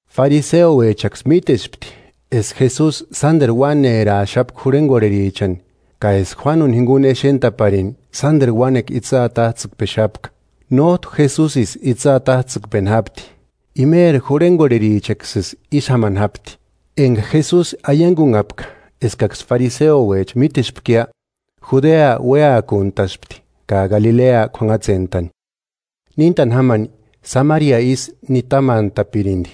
Fariseouechaksï mítespti eska Jesusi sánderu uáneraaxapka jurhengorherichani, ka eska Juánuni jinguni exentaparini, sánderu uánekua itsï atajtsikpexapka. Nójtu Jesusisï itsï atajtsïkpeni jápti, imeri jurhengorherichaksïsï ísï jámani jápti. Enga Jesusi aiangunhapka eskaksï fariseouecha mítespkia, Judea uéakuntaspti ka Galilea k'uanhatsentani. Níntani jámani, Samaria isï nitamantapirindi.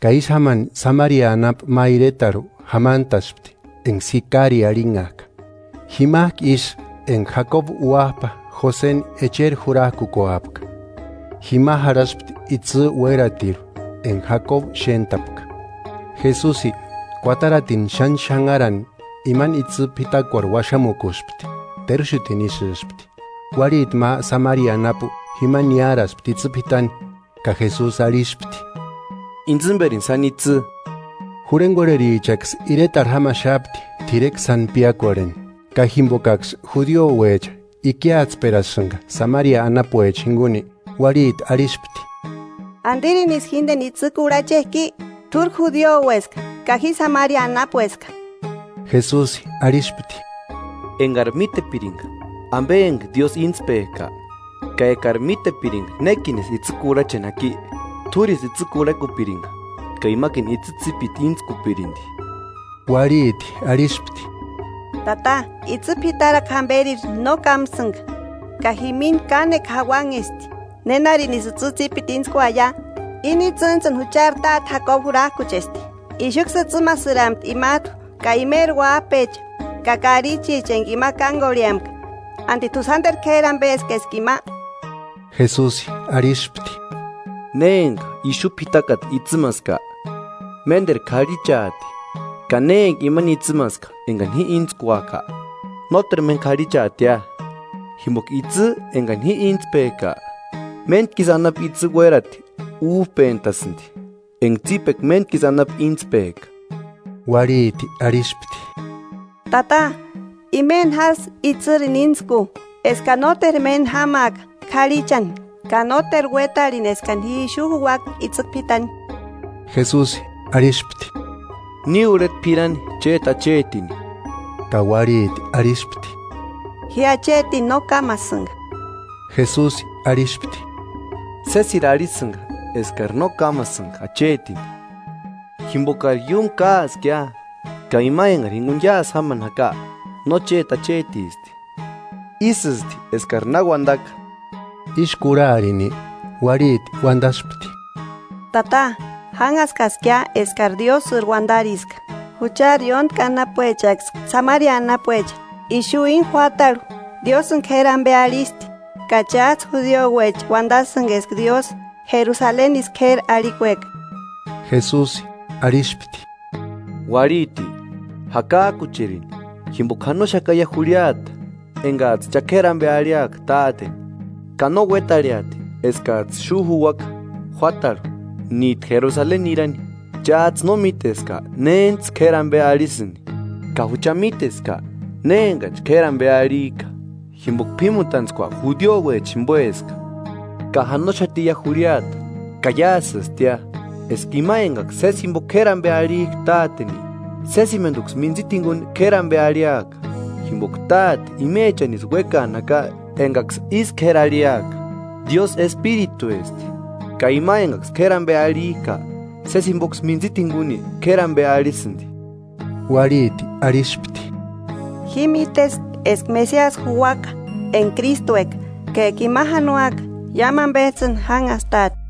Ka ísï jámani Samaria anapu ma iretarhu jamantaspti enga Sikari arhinhajka, jimajku isï enga Jakobu uájpa Joseni echeri jurajkukuapka. Jima jarhaspti itsï uératirhu enga Jakobu xéntapka. Jesusi, kuataratini xáni xanharani, imani itsï p'itakuarhu uaxamukuspti. Teruxutini isïspti. Uarhiti ma Samaria anapu jima niáraspti itsï p'itani ka Jesusi arhispti: –Intsïmberini sáni itsï. Jurhengorherichaksï iretarhu jámaxapti t'irekua sáni piákorheni. Ka jimbokaksï judiouecha ikiatsperasïnga Samaria anapuecha jinguni, uarhiti arhispti: –¿Andirinisï jíndeni itsï kurhachejki? ¿T'úri judioueska, ka ji Samaria anapueska? Jesusi arhispti: –Engari mítepiringa ambe enga Diósï íntspejka, ka ekari mítepiringa nékinisï itsï kurhacheni jaki, t'úrisï itsï kurhakupiringa, ka imakini itsï tsípiti íntskupirindi. Uarhiti arhispti: –Tata, itsï p'itarakua jámberiri no kámasïnga, ka jimini kánekua jauanhesti: ¿Nénarinisï itsï tsipiti íntskuaia? Íni itsïnijtsïni Juchari táte Jakobu jurajkuchesti, ixuksï itsïmasirempti imajtu ka imeri uájpecha ka karichicha enga ima kángorheauempka. ¿Andi t'u sánderu k'éri ambeski eska ima? Jesusi arhispti: –Ne enga ixu p'itakata itsïmaska, ménderu k'arhichaati; ka ne enga imani itsïmaska engani ji íntskuaka, nóteru méni k'arhichaatia. Jimboka itsï engani ji íntspejka, méntkisï anapu itsï uérati újpentasïndi, enga tsípekua méntkisï anapu íntspejka. Uarhiti arhispti: –Tata, imeni jásï itsïrini íntsku, eskani nóteru méni jámaaka k'arhichani ka nóteru uétarheni eskani ji ixu juuaka itsï p'itani. Jesusi arhispti: –Ni urheta p'irani chéti achetini. Ka uarhiti arhispti: –Ji achetini no kámasïnga. Jesusi arhispti: –Sésiri arhisïnga eskari no kámasïnga achetini; jimbokari iúmu káaskia, ka ima engari jinguni iásï jámani jaka no chéti achetisti. Ísïsti eskari na uandaka. Ísï kurharini, uarhiti uandaspti: –Tata, jánhaskaskia eskari Diósïri uandariska. Juchari ióntki anapuechaksï Samaria anapuecha, ixu íni juátarhu Diósïni k'éri ambe arhisti; ka chájtsï judiouecha uandasïnga eska Diósï Jerusalenisï k'éri arhikueka. Jesusi arhispti: –Uarhiti, jakajkucherini, jimboka janoxakaia jurhiata engajtsï cha k'éri ambe arhiaka Táteni ka no uétarheati eskajtsï ixu juuaka juátarhu níjtu Jerusaleni nirani. Chájtsï no míteska nénijtsï kéri ambe arhisïni; ka jucha míteska néni enganichi k'éri ambe arhijka, jimboka p'ímutantskua judiouecha jimboeska. Ka janoxatiia jurhiata, ka iásïstia, eska ima engaksï sési jimbo k'éri ambe arhijka Táteni, sésimenduksï mintsita jinguni k'éri ambe arhiaka. Jimboka Táte imechanisï uékaani jaka engaksï ísï k'éri arhiaka. Diósï Espirituesti, ka ima engaksï k'éri ambe arhijka, sési jimboksï mintsita jinguni k'éri ambe arhisïndi. Uarhiti arhispti: –Ji míteska eska Mesiasi juuaka (enga Krístueka); ka eka ima janoaka, iámu ambejtsïni jánhastaati.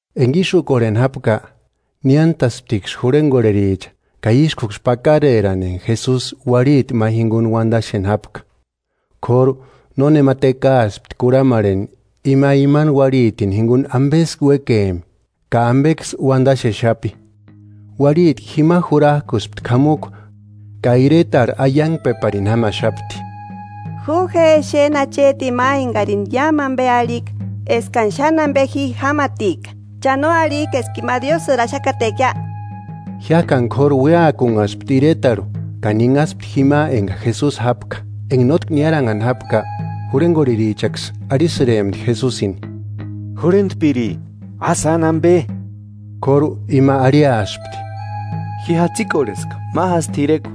Enga ísï úkorheni jápka, niántasptiksï jurhengorhericha, ka ískuksï pakarerani enga Jesusi uarhiti ma jinguni uandaxeni jápka. K'óru nónema tekaaspti kurhamarheni ima imani uarhitini jinguni ambesï uékempki, ka ambeksï uandaxexapi. Uarhiti jima jurajkuspti k'amukua ka iretarhu aiangpeparini jámaxapti: 29–Ju je exeni achetini ma engarini iámu ambe arhika eskani xáni ambe ji jámatika. ¿Cha no arhijki eska ima Diósïri axakatekia? Jiájkani k'óru uéakunhaspti iretarhu ka ninhaspti jima enga Jesusi jápka. Enga nótki niaranhani jápka jurhegorherichaksï arhisïrempti Jesusini: –Jurhentpiri, a sáni ambe. K'óru ima arhiaspti: –Ji jatsikorheska ma jásï t'irekua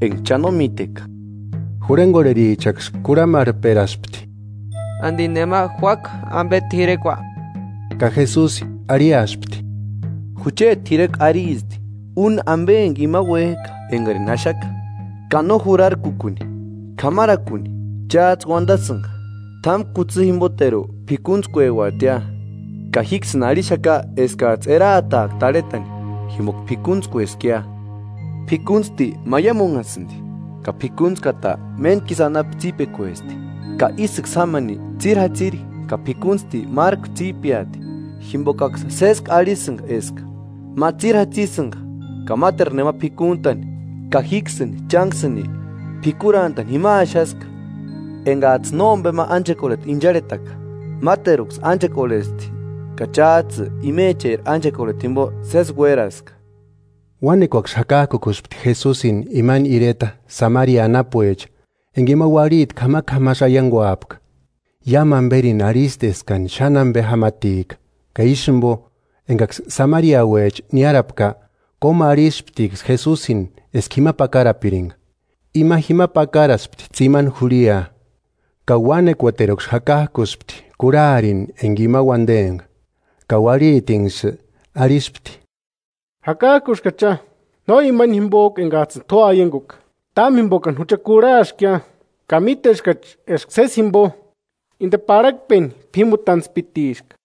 enga cha no míteka. Jurhengorherichaksï kurhamarhperaspti: –¿Andi nema juáku ambe ma t'irekua? Ka Jesusi arhiaspti: –Jucheti t'irekua aristi: Úni embe enga ima uéjka engarini axaka ka no jurarkukuni, k'amarakuni. Chájtsï uandasïnga: T'ámu kutsï jimboteru p'íkuntskueuatia; ka jíksïni arhixaka eskajtsï eraataaka tarhetani, jimboka p'ikuntskueskia. P'ikuntsti maiamunhasïndi, ka p'ikuntskata méntki isï anapu tsípekuesti, ka ísïksï jámani tsíri jatsïri ka p'ikunsti márku tsípeati. Jimbokaksï sésku arhisïnga eska: Ma tsíri jatsisïnga ka máteru nema p'ikuntani. Ka jíksïni chánksïni p'ikurantani jima axaska engajtsï nómbema ánchekorheta incharhetaka; máteruksï ánchekorhesti, ka chájtsï imecheri ánchekorheta jimbo sési uéraska. Uánekuaksï jakajkukuspti Jesusini imani ireta Samaria anapuecha, enga ima uarhiti k'amak'amasï aianguapka: “Iámu amberini arhisti eskani xáni ambe jámatika.” Ka ísï jimbo, engaksï Samariauecha niárapka, kómu arhisptiksï Jesusini eska jima pakarapiringa. Ima jima pakaraspti tsimani jurhia, ka uánekuateruksï jakajkuspti kurharini enga ima uandempka. Ka uarhitinksï arhispti. –Jakajkuskachia, no imani jimbojku engajtsïni t'u aianguka, támu jimbokani jucha kurhaskia ka míteskachi eska sési jimbo inde parhakpeni P'ímutantspitiska.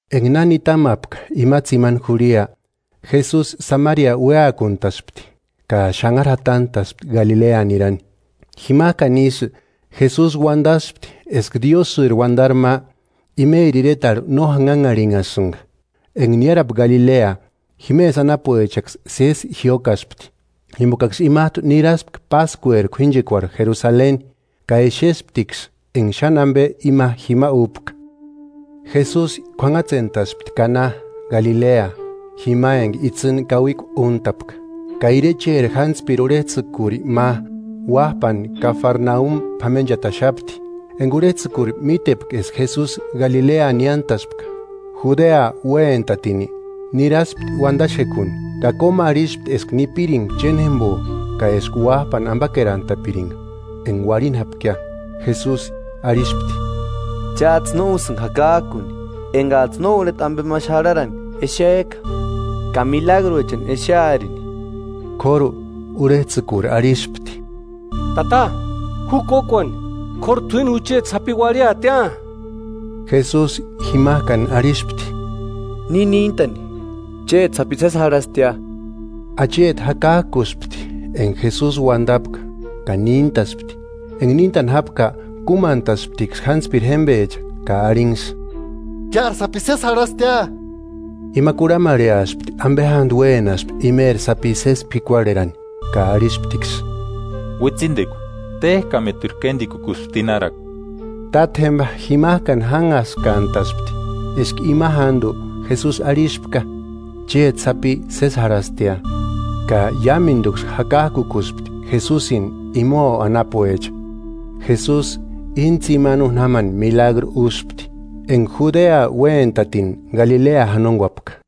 Enga na nitamapka ima tsimani jurhia, Jesusi Samaria uéakuntaspti ka xanhari jatantaspti Galilea nirani. Jimajkani isï, Jesusi uandaspti eska Diósïri uandari ma, imeri iretarhu no janhanharhinhasïnga. Enga niárapka Galilea, jimesï anapuechaksï sési jiókaspti, jimbokaksï imajtu niraspka Páskueri k'uínchekuarhu Jerusaleni ka exesptiksï enga xáni ambe ima jima úpka. Jesusi k'uanhatsentaspti Kana, Galilea, jima enga itsïni kauikua úntapka. Ka irecheri jántspiri urhejtsïkuri ma, uájpani Kafarnaumi p'amenchataxapti. Enga urhejtsïkuri mítepka eska Jesusi Galilea niántaspka, Judea uéntatini, niraspti uandaxekuni ka kómu arhispti eska nipiringa chénjembo ka eska uájpani ambakerantapiringa, enga uarhini jápkia. Jesusi arhispti: –Chájtsï no úsïnga jakajkuni engajtsï no urheta ambe ma xarharani exejka ka milagruechani exearini. K'óru, urhejtsïkuri arhispti: –Tata, ju kókuani, k'óru t'uíni jucheti sapi uarhiatia. Jesusi jimajkani arhispti: –Ni níntani; chéti sapi sési jarhastia. Acheti jakajkuspti enga Jesusi uandapka ka níntaspti. Enga níntani jápka kúmantasptiksï jántspiri jémbecha ka arhinksï: –¡Chári sapi sési jarhastia! Ima kurhamarheaspti ambe jándu uénaspi imeri sapi sési p'ikuarherani, ka arhisptiksï: –Uitsindekua téjkamatiru kéndikukusti tinharakua. Tátjemba, jimajkani jánhaskantaspti eska ima jándu Jesusi arhispka: “Chéti sapi sési jarhastia”; ka iámenduksï jakajkukuspti Jesusini, imao anapuecha. Jesusi, íni tsimani úni jámani milagru úspti, enga Judea uéntatini Galilea janonguapka.